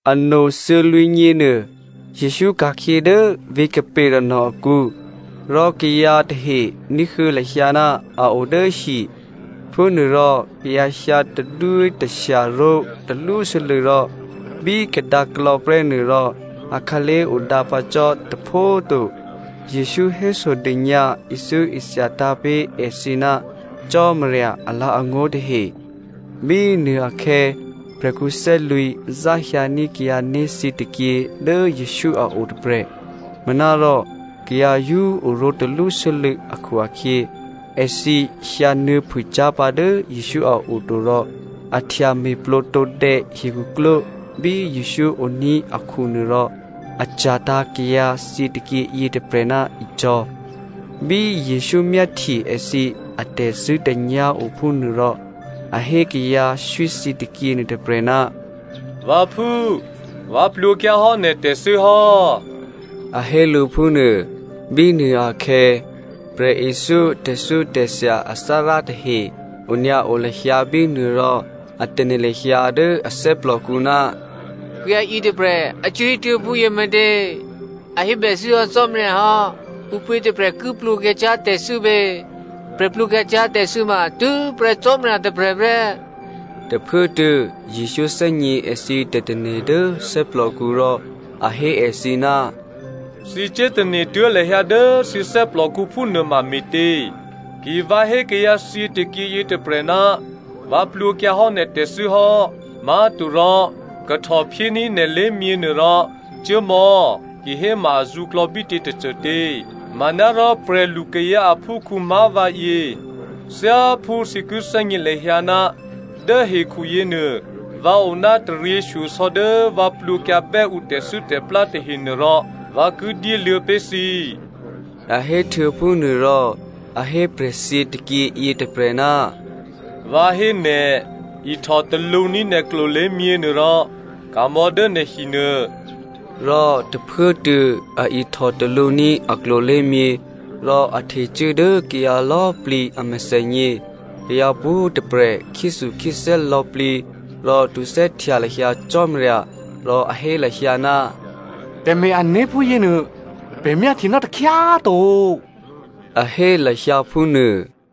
Ano thuô̌lwǐ̤nyěnuô Jesǔ ka̤khyě dố vǐ̤ Capernaum akǔ rò kayǎ tahe ní̤huô̌ lahyǎ ná a o dố hi. Phúnuôrò kayǎ hyǎ tadwítashya ró̤ talwósû́lû̌ rò bí kadǎklò̌ prè́nuô rò akhǎlé̤ odǎ pǎ cò́ tôpho꤮ to. Jesǔ hésodônyǎ ithyóithyatǎ̤ pé̤ èthǐ ná Cò́marya alǎ̤angó̤ tahe. Bínuô akhè̌ prè̤khǔ thè́lwǐ̤ záhyǎní̤ kayǎné̤ thyětôkyě dố Jesǔ a o tôprè̤. Manárò kayǎ yǒ oró̤ talwósû́lû̌ akhu-akhyě, èthǐ hyǎnuô̌phûcyá̤ pǎ dố Jesǔ a o to rò a htya me̤plǒ tǒdè̌ hikhuklwó bí Jesǔ oní̤ akhunuô rò a cya̤tǎ̤ kayǎ thyětôkyě yětôprè̤ ná icò̤̌. Bí Jesǔ myáhtye èthǐ atè̤zṳ̂́tè̤nyá̤ o phúnuô rò a hé kayǎ swí thyětôkyě nuôtôprè̤, “Vǎphú꤮ vǎ plwǒkyǎhò́ nè̤ tè̤thû́ hò́,” a hé lǔ phúnuô. Bínuô akhè̌ prè̤ithyó tè̤thyótè̤thya athárá tahe onyǎo lahyǎ bínuô rò a tane̤ lahyǎ dố a thè́plòkǔ, “Kayǎ yětôprè̤ a cuố hétuố̤ phúyě me̤tě? È hébèthû́ hò́ Cò́marya hò́. Ǔpě tôprè̤ ki plwǒkyǎ cyá̤ tè̤thû́ pě? Prè̤ plwǒkyǎ cyá̤ tè̤thû́ ma tû́prè́ Cò́marya tôprè̤ prè́.” Tôphuốtuô̌ Jesǔ thè́gně èthǐ tè̤tane̤ dố thè́plòkǔ rò a hé èthǐ, “Thǐ cuốtane̤ tuố̤ lahyǎ dố thǐ thè́plòkǔ phúnuôma me̤tě? Ki vǎ hé kayǎ thyětôkyě yětôprè̤, ‘Vǎ plwǒkyǎhò́ nè̤ tè̤thû́ hò́’ má̤torò ‘Kahtò phyéní̤ nè̤ lé̤myěnuô rò cuố mò̌’ kihéma azǔklò̌ bítě tôcôtě? Manárò prè̤lukayǎ aphúkhǔ má̤ vǎyě, thyáphú thǐ ki thè́gně lahyǎ ná dố hekhu yěnuô, vǎ o ná taryěshyosò̌ dố vǎ plwǒkyǎbè́ ǔ tè̤thû́tè̤plá tahenuôrò, vǎ ki dyéluô̌ pé̤ thǐ,” a hé htuô̌phúnuôrò, a hé prè̤thyětôkyě yětôprè̤, “Vǎ hé nè̤, ihtò talǔní̤ nè̤ klolé̤myě nuôrò ka̤mò̌ dố nè̤ hinuô.” Rò tôphuốtuô̌ a ihtò talǔní̤ a klolé̤myě rò a htecuố dố kayǎ lò̌꤮ plǐ a mèthènyě. Kayǎ pwǒ̤꤮ tôprè̤ khyéthukhyéthè́ lò̌plǐ rò htuthè́htya lahyǎ Cò́marya rò a hé lahyǎ, “Tè̤me̤-ané̤ phúyěnuô, pè̤ myáhtyenò́ takhyá꤮ to,” a hé lahyǎ phúnuô.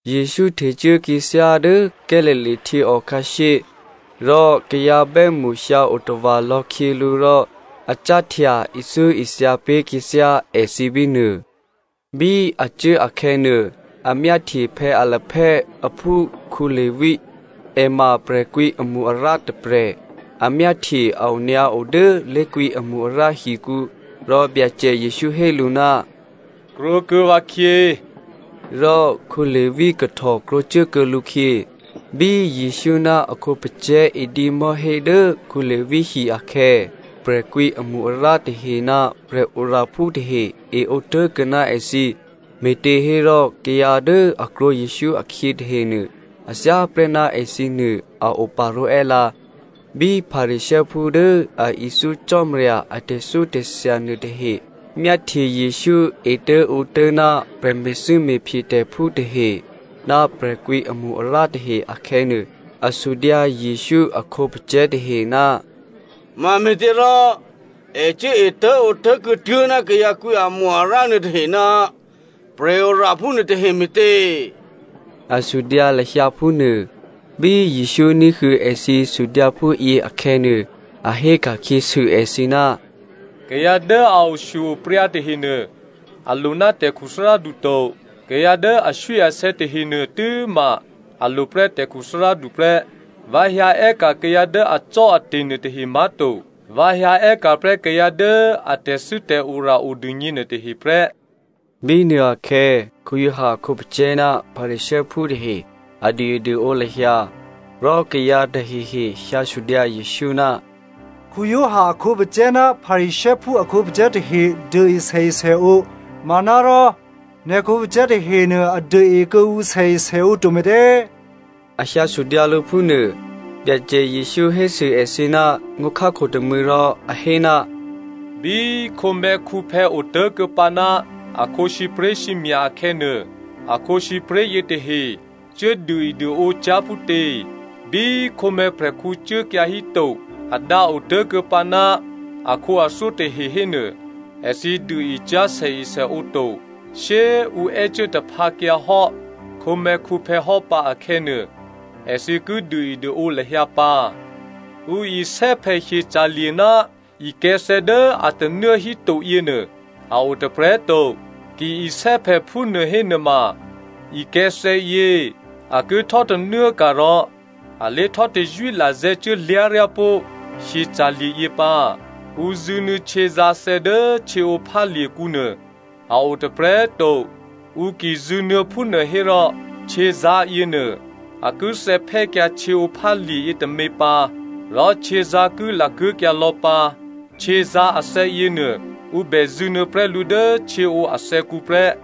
Jesǔ htecuố khyěthyá dố Galilea htyěò khǎshyé rò kayǎ bè́mṳ hyǎ otava̤ lò̌ khyě lǔ rò a cáhtya ithyóithya pé̤ khyěthyá èthǐ bínuô. Bí a cuố akhè̌nuô, a myáhtye Alphaeo aphú Levi. È ma prè̤kwǐ amo-arǎ tôprè̤. A myáhtye a onyǎo dố lé̤kwǐamo-arǎ hikǔ rò Byacè Jesǔ hé lǔ, “Krwǒkuô̌ vǎkhyě,” rò Levi kahtò krwǒcuốkuô̌ lǔkhyě. Bí Jesǔ ná a khǒpacè̤̌ edǐ mò̤́hé dố Levi hi akhè̌, prè̤kwǐ amo-arǎ tahe ná prè̤oraphú tahe e ǒ tố̤kuô̌ ná èthǐ, me̤těhérò kayǎ dố a krwǒ Jesǔ akhyě tahenuô, a thyáprè́ ná èthǐnuô a oparó̤ è́lǎ. Bí Pharisěophú dố a ithyó Cò́marya a tè̤thyótè̤thya nuôtahe myáhtye Jesǔ etố̤ǒtố̤ ná prè̤me̤thû́me̤phyetè̤phú tahe ná prè̤kwǐ amo-arǎ tahe akhè̌nuô, a sudyǎ Jesǔ a khǒpacè̤̌ tahe, “Mame̤těrò è cuố etố̤ǒtố̤ kuô̌tuố̤ ná kayǎ kwǐ amo-arǎ nuôtahe ná prè̤oraphú nuôtahe me̤tě?” A sudyǎ lahyǎ phúnuô. Bí Jesǔ ní̤huô̌ èthǐ sudyǎ phúyě akhè̌nuô, a héka̤khyěsû èthǐ, “Kayǎ dố a oshyo-opryǎ tahenuô, a lo ná tè̤khuthárádu to, kayǎ dố aswíasè̌ tahenuô tû́ma a lo prè́ tè̤khuthárádu prè́. Vǎ hyǎ è́ka̤ kayǎ dố acò́ate̤ nuôtahe má̤to. Vǎ hyǎ è́ka̤prè́ kayǎ dố a tè̤thû́tè̤ora odûgně nuôtahe prè́.” Bínuô akhè̌ Giovanni a khǒpacè̤̌ ná Pharisěophú tahe a duôeduôǒ lahyǎ. Rò kayǎ tahehe hyǎ sudyǎ Jesǔ, “Giovanni a khǒpacè̤̌ ná Pharisěophú a khǒpacè̤̌ tahe duôe sèesèǒ, manárò nè̤ khǒpacè̤̌ tahenuô a duôe kuô̌ǔ sèesèǒ to me̤tě?” A hyǎ sudyǎ lǔ phú nuô. Byacè Jesǔ hésû èthǐ ná ngó̤khákho tômû̌ rò a hé, “Bí khǒmè̤̌khǔphè̌ otố̤kuô̌pǎ ná akhǒ sǐpré̤sǐmya̤ akhè̌nuô, a khǒsǐpré̤ yětahe cuốduôeduôǒ cyá̤ phútě? Bí khǒmè̤̌prè̤khǔ cuốkyǎ híto, a dǎ otố̤kuô̌pǎ ná akhǒathyó tahe hénuô, èthǐ duôe cyá̤ sèesèǒ to. Shyé꤮ ǔ è́cuố taphǎkyǎhò́ khǒmè̤̌khǔphè̌ hò́ pǎ akhè̌nuô, èthǐ ki duôeduôǒ lahyǎ pǎ. “Ǔ isè́phè hyeca̤lye̤ ná ikè̤̌thè̌ dố a tanuố hítoyě nuô a o tôprè̤꤮ to. Ki isè́phè phúnuô hénuôma ikè̤̌thè̌yě a ki htò́tanuốka̤ rò a lé htò́tazwí lazè̤̌ cuốlyá̤ryá pó̤ hyeca̤lye̤yě pǎ. Ǔ zṳ̂nuô̌ htyězǎ̤thè̌ dố htyěǒphálye̤kǔ nuô a o tôprè̤꤮ to. Ǔ ki zṳ̂nuô̌ phúnuô hérò htyězǎ̤ yěnuô a ki thè̌phè́kyǎ htyěǒphálye̤ yětômě pǎ, rò htyězǎ̤ ki lakuố̤kyǎ lò̌ pǎ. Htyězǎ̤ athè̌ yěnuô ǔ bè zṳ̂nuô̌ prè́ lǔ dố htyěǒ athè̌kǔ prè́.”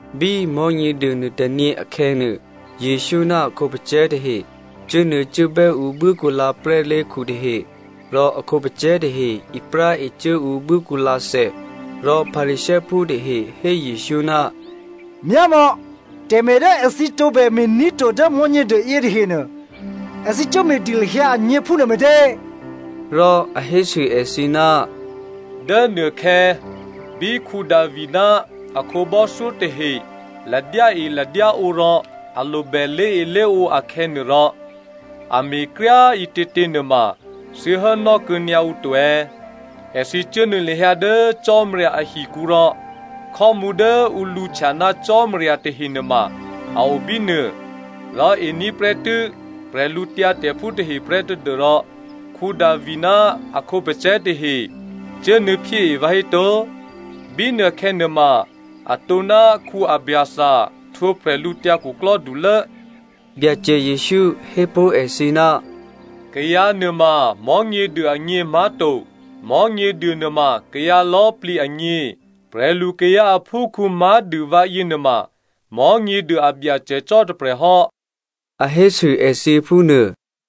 Bí Mò̤́nyěduô nuôtônyě akhè̌nuô, Jesǔ ná a khǒpacè̤̌ tahe cuốnuô̌cuốbè́ ǔ buốkǔlǎ prè́lé̤khu tahe, rò a khǒpacè̤̌ tahe ipráe cuố ǔ buốkǔlǎthè. Rò Pharisěophú tahe hé Jesǔ, “Myámò̌, tè̤me̤ dố èthǐ tǒbè me̤ní̤ to dố Mò̤́nyěduô yětahenuô, èthǐ cuốme̤dû lahyǎ agně phúnuô me̤tě?” Rò a hésû èthǐ, “Dố nuôkhè̌ bí Davi ná a khǒbò́thyó tahe ladyáeladyáǒ rò a lobè lé̤elé̤ǒ akhè̌nuôrò, a me̤kryá꤮ ǐtětě nuôma thǐ hốnò́ kuô̌nyǎ ǔ to è̌? Èthǐ cuốnuô̌ lahyǎ dố Cò́marya ahikǔ rò khò́mǔ dố ǔ lǔhtya ná Cò́marya tahe nuôma a o bínuô, rò ení̤ prè́tû́ prè̤lǔtyǎtè̤phú tahe prè́ tadû́rò Davi ná a khǒpacè̤̌ tahe cuốnuô̌phyée vǎhéto? Bínuôkhè̌ nuôma atǒ ná Abiathar htwǒ bwídukhulố.” Byacè Jesǔ hépó̤ èthǐ, “Kayǎ nuôma Mò̤́nyěduô agně má̤to, Mò̤́nyěduô nuôma kayǎ lò̌꤮ plǐ agně. Prè̤lu kayǎ aphúkhǔ má̤dû vǎ yěnuôma Mò̤́nyěduô a Byacè cò́ tôprè̤hò́,” a hésû èthǐ phúnuô.